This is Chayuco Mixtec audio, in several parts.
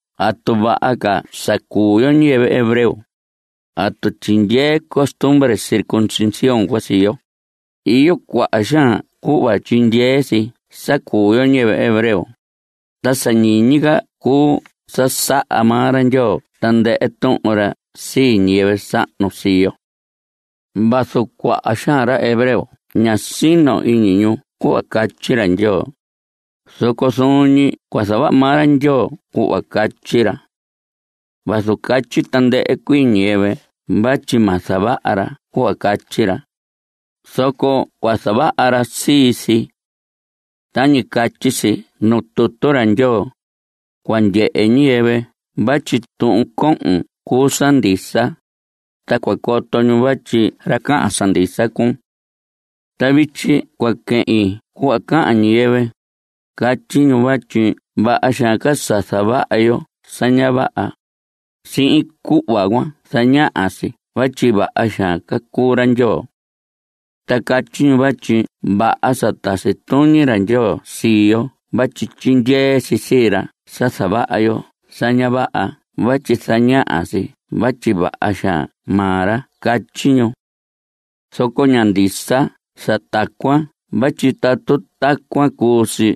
¿Atu vaha ca sa cuu yo ñiyɨvɨ hebreo? ¿Atu tyindyee costumbre circuncisión cuan sii yo? Iyo cuaha xaan cuhva tyindyee si sa cuu yo ñiyɨvɨ hebreo, ta sa ñiñi ca cuu sa saha maa ra Ndyoo tandɨhɨ tuhun ra sii ñiyɨvɨ sahnu sii yo. Vazu cuaha xaan ra hebreo ña sino iñi cuhva catyi ra Ndyoo, zoco zuun ñi cua zavaha maa ra Ndyoo cuhva catyi ra. Vazu catyi tandɨhɨ cuii ñiyɨvɨ vatyi ma zavaha ra cuhva catyi ra, zoco cua zavaha ra sii si. Tañi catyi si nuu tutu ra Ndyoo: “Cua ndyehe ñiyɨvɨ vatyi tuhun cohon cuu sa ndisa, ta cua coto ñu vatyi ra cahan sa ndisa cuun.” Ta vityi cua quehin cuhva cahan ñiyɨvɨ. Catyi ñu vatyi vaha xaan ca sa zavaha yo sa ña vaha, ta sihin cuhva cuan zañaha si vatyi vaha xaan ca cuu ra Ndyoo. Ta catyi ñu vatyi ña vaha sa tasi tuñi ra Ndyoo sii yo vatyi tyindyee si sii ra sa zavaha yo sa ña vaha vatyi zañaha si vatyi vaha xaan maa ra, catyi ñu. Zoco ña ndisa sa tacuan vatyi tatu tacuan cuu si,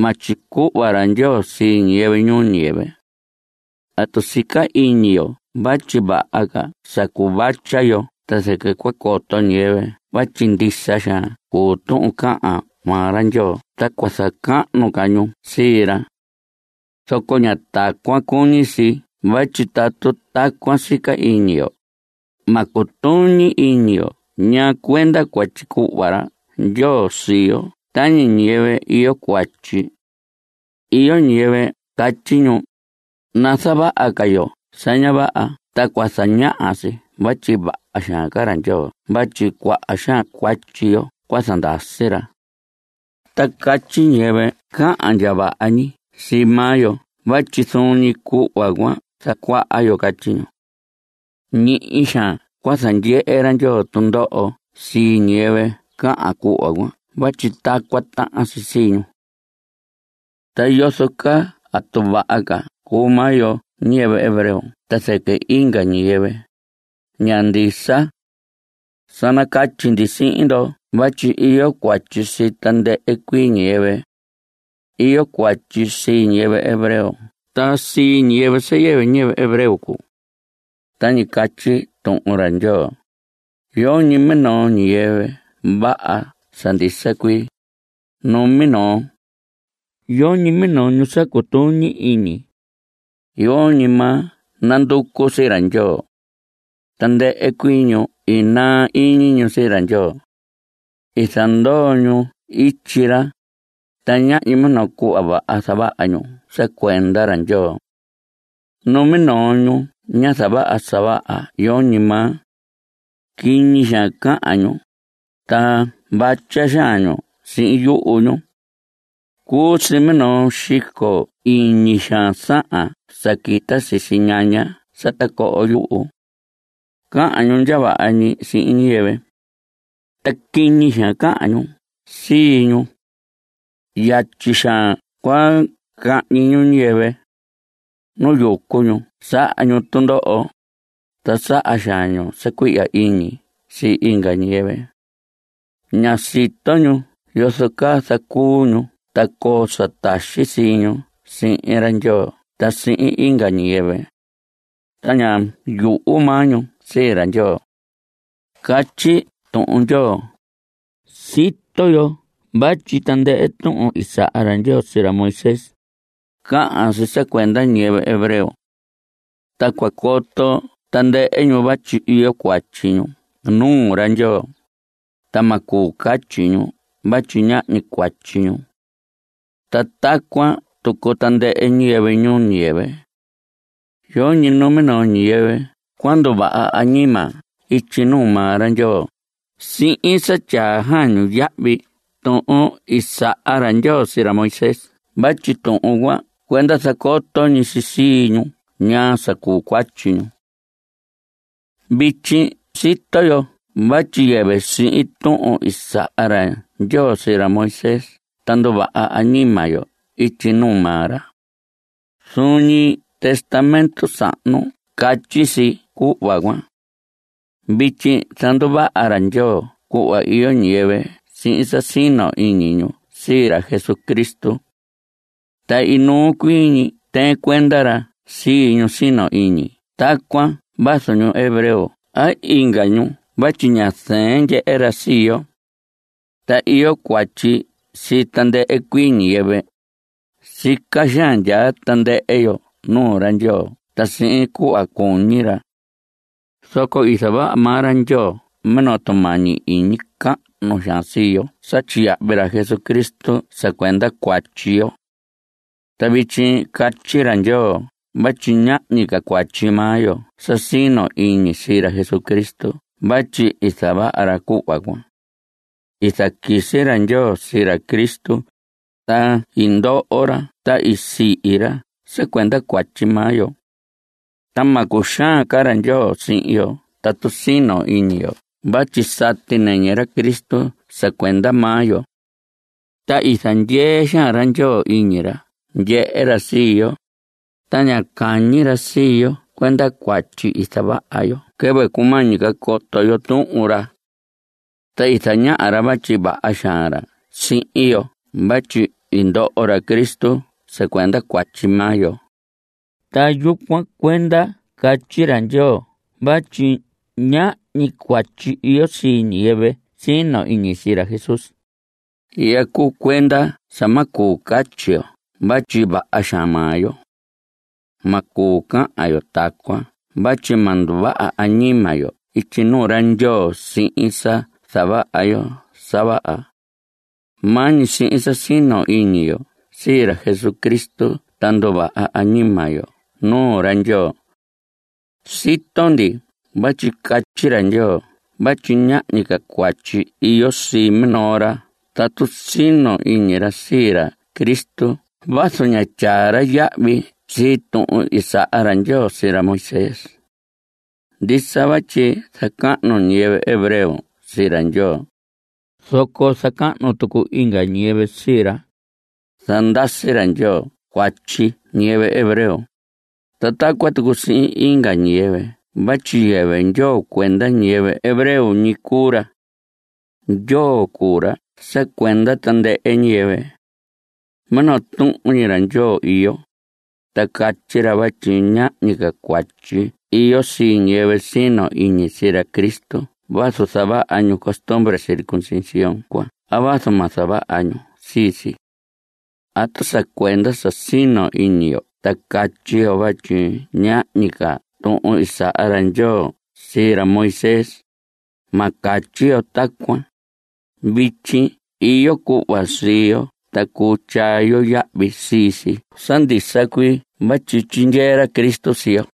ma tyicuhva ra Ndyoo sii ñiyɨvɨ ñuu ñiyɨvɨ. Tatu sica iñi yo vatyi vaha ca sa cuvatya yo ta zɨquɨ cua coto ñiyɨvɨ vatyi ndisa xaan cuu tuhun cahan maa ra Ndyoo ta cua zacahnu ca ñu sii ra. Zoco ña tacuan cuñi si vatyi tatu tacuan sica iñi yo, ma cutuñi iñi yo ñaa cuenda cua tyicuhva ra Ndyoo sii yo tañi ñiyɨvɨ iyo cuatyi. Iyo ñiyɨvɨ catyi ñu: “Nazavaha ca yo sa ña vaha ta cua zañaha si vatyi vaha xaan ca ra Ndyoo vatyi cuaha xaan cuatyi yo cua zandasi ra.” Ta catyi ñiyɨvɨ cahan ndya vaha ñi sii maa yo vatyi zuun ñi cuhva cuan zacuaha yo, catyi ñu. Ñihi xaan cua zandyehe ra Ndyoo tundoho sii ñiyɨvɨ cahan cuhva cuan vatyi tacuan tahan si sii ñu. Ta yozo caa ¿atu vaha ca cuu maa yo ñiyɨvɨ hebreo ta zɨquɨ inga ñiyɨvɨ? Ña ndisa. Sa nacatyi ndi sihin ndo vatyi iyo cuatyi sii tandɨhɨ cuii ñiyɨvɨ. Iyo cuatyi sii ñiyɨvɨ hebreo ta sii ñiyɨvɨ sa yɨvɨ ñiyɨvɨ hebreo cuu. Tañi catyi Tuhun ra Ndyoo: Yoñi minoo ñiyɨvɨ vaha sa ndisa cuii, numinoo. Yoñi minoo ñu sa cutuñi iñi. Yoñi maa nanducu sii ra Ndyoo. Tandɨhɨ cuii ñu i naa iñi ñu sii ra Ndyoo. I zandoo ñu ityi ra, ta ñahñi minoo cuhva vaha zavaha ñu sa cuenda ra Ndyoo. Numinoo ñu ña zavaha sa vaha, yoñi maa. Quiñi xaan cahan ñu, ta vatya xaan ñu sihin yuhu ñu. Cuu si minoo xico iñi xaan sahan sa quita sisi ñaña sa tacoho yuhu. Cahan ñu ndya vaha ñi sihin ñiyɨvɨ. Ta quiñi xaan cahan ñu sii ñu. Yatyi xaan cua cahñi ñu ñiyɨvɨ. Nu yucu ñu saha ñu tundoho, ta saha xaan ñu sa cuihya iñi sii inga ñiyɨvɨ. Ña sito ñu yozo caa zacuu ñu ta coo sa taxi sii ñu sihin ra Ndyoo ta sihin inga ñiyɨvɨ. Ta ña yuhu maa ñu sii ra Ndyoo. Catyi Tuhun ra Ndyoo. Sito yo vatyi tandɨhɨ tuhun i saha ra Ndyoo sii ra Moisés, cahan si sa cuenda ñiyɨvɨ hebreo. Ta cua coto tandɨhɨ ñu vatyi iyo cuatyi ñu nuu ra Ndyoo, ta ma cuu catyi ñu vatyi ñahñi cuatyi ñu. Ta tacuan tucu tandɨhɨ ñiyɨvɨ ñuu ñiyɨvɨ. Yoñi numinoo ñiyɨvɨ cua nduvaha añima ityi nuu maa ra Ndyoo sihin sa tyaa xaan ñu yahvi tuhun i saha ra Ndyoo sii ra Moisés vatyi tuhun cuan cuenda zacoto ñi si sii ñu ñaa sa cuu cuatyi ñu. Vityi sito yo vatyi yɨvɨ sihin tuhun i saha ra Ndyoo sii ra Moisés ta nduvaha añima yo ityi nuu maa ra. Zuun ñi Testamento Sahnu catyi si cuhva cuan. Vityi zanduvaha ra Ndyoo cuhva iyo ñiyɨvɨ sihin sa sino ñi iñi ñu sii ra Jesucristo. Ta inuu cuii ñi tɨɨn cuenda ra sii ñu sino iñi tacuan vazu ñu hebreo a inga ñu vatyi ña zɨɨn ndyehe ra sii yo. Ta iyo cuatyi sii tandɨhɨ cuii ñiyɨvɨ. Sica xaan ndyaa tandɨhɨ yo nuu ra Ndyoo ta sihin cuhva cuñi ra. Zoco i zavaha maa ra Ndyoo minoo tumañi iñi cahnu xaan sii yo sa tyiyahvi ra Jesucristo sa cuenda cuatyi yo. Ta vityi catyi ra Ndyoo vatyi ñahñi ca cuatyi maa yo sa sino iñi sii ra Cristo vatyi i zavaha ra cuhva cuan. I zaquisi ra Ndyoo sii ra Cristo. Ta i ndoho ra. Ta i sihi ra sa cuenda cuatyi maa yo. Ta ma cuxaan ca ra Ndyoo sihin yo tatu sino iñi yo vatyi sati nɨñɨ ra Cristo sa cuenda maa yo. Ta i zandyee xaan ra Ndyoo iñi ra ndyehe ra sii yo, ta ña cañi ra sii yo cuenda cuatyi i zavaha yo quɨvɨ cumañi ca coto yo Tuhun ra. Ta i zañaha ra vatyi vaha xaan ra sihin yo vatyi i ndoho ra Cristo sa cuenda cuatyi maa yo. Ta yucuan cuenda catyi ra Ndyoo vatyi ñahñi cuatyi iyo sii ñiyɨvɨ sino iñi sii ra Jesús. Ihya cuu cuenda sa ma cuu catyi yo vatyi vaha xaan maa yo. Ma cuu cahan yo tacuan vatyi ma nduvaha añima yo ityi nuu ra Ndyoo sihin sa zavaha yo sa vaha. Maa ñi sihin sa sino iñi yo sii ra Jesucristo ta nduvaha añima yo nuu ra Ndyoo. Sito ndi vatyi catyi ra Ndyoo vatyi ñahñi cuatyi iyo sii minoo ra tatu sino iñi ra sii ra Cristo vazu ña tyaa ra yahvi sii tuhun i saha ra Ndyoo sii ra Moisés. Ndisa vatyi zacahnu ñiyɨvɨ hebreo sii ra Ndyoo, zoco zacahnu tucu inga ñiyɨvɨ sii ra. Zandasi ra Ndyoo cuatyi ñiyɨvɨ hebreo, ta tacuan tucu sihin inga ñiyɨvɨ vatyi yɨvɨ Ndyoo cuenda ñiyɨvɨ hebreo ñi cuu ra. Ndyoo cuu ra sa cuenda tandɨhɨ ñiyɨvɨ. Minoo tuhun ñi ra Ndyoo iyo, ta catyi ra vatyi ñahñi ca cuatyi iyo sii ñiyɨvɨ sino iñi sii ra Cristo vazu zavaha ñu costumbre circuncisión cuan a vazu ma zavaha ñu sii si. ¿Atu sa cuenda sa sino iñi yo ta catyi yo vatyi ña ñiñi ca tuhun i saha ra Ndyoo sii ra Moisés? Ma catyi yo tacuan. Vityi iyo cuhva sii yo ta cuu tyaa yo yahvi sii si sa ndisa cuii vatyi tyindyee ra Cristo sii yo.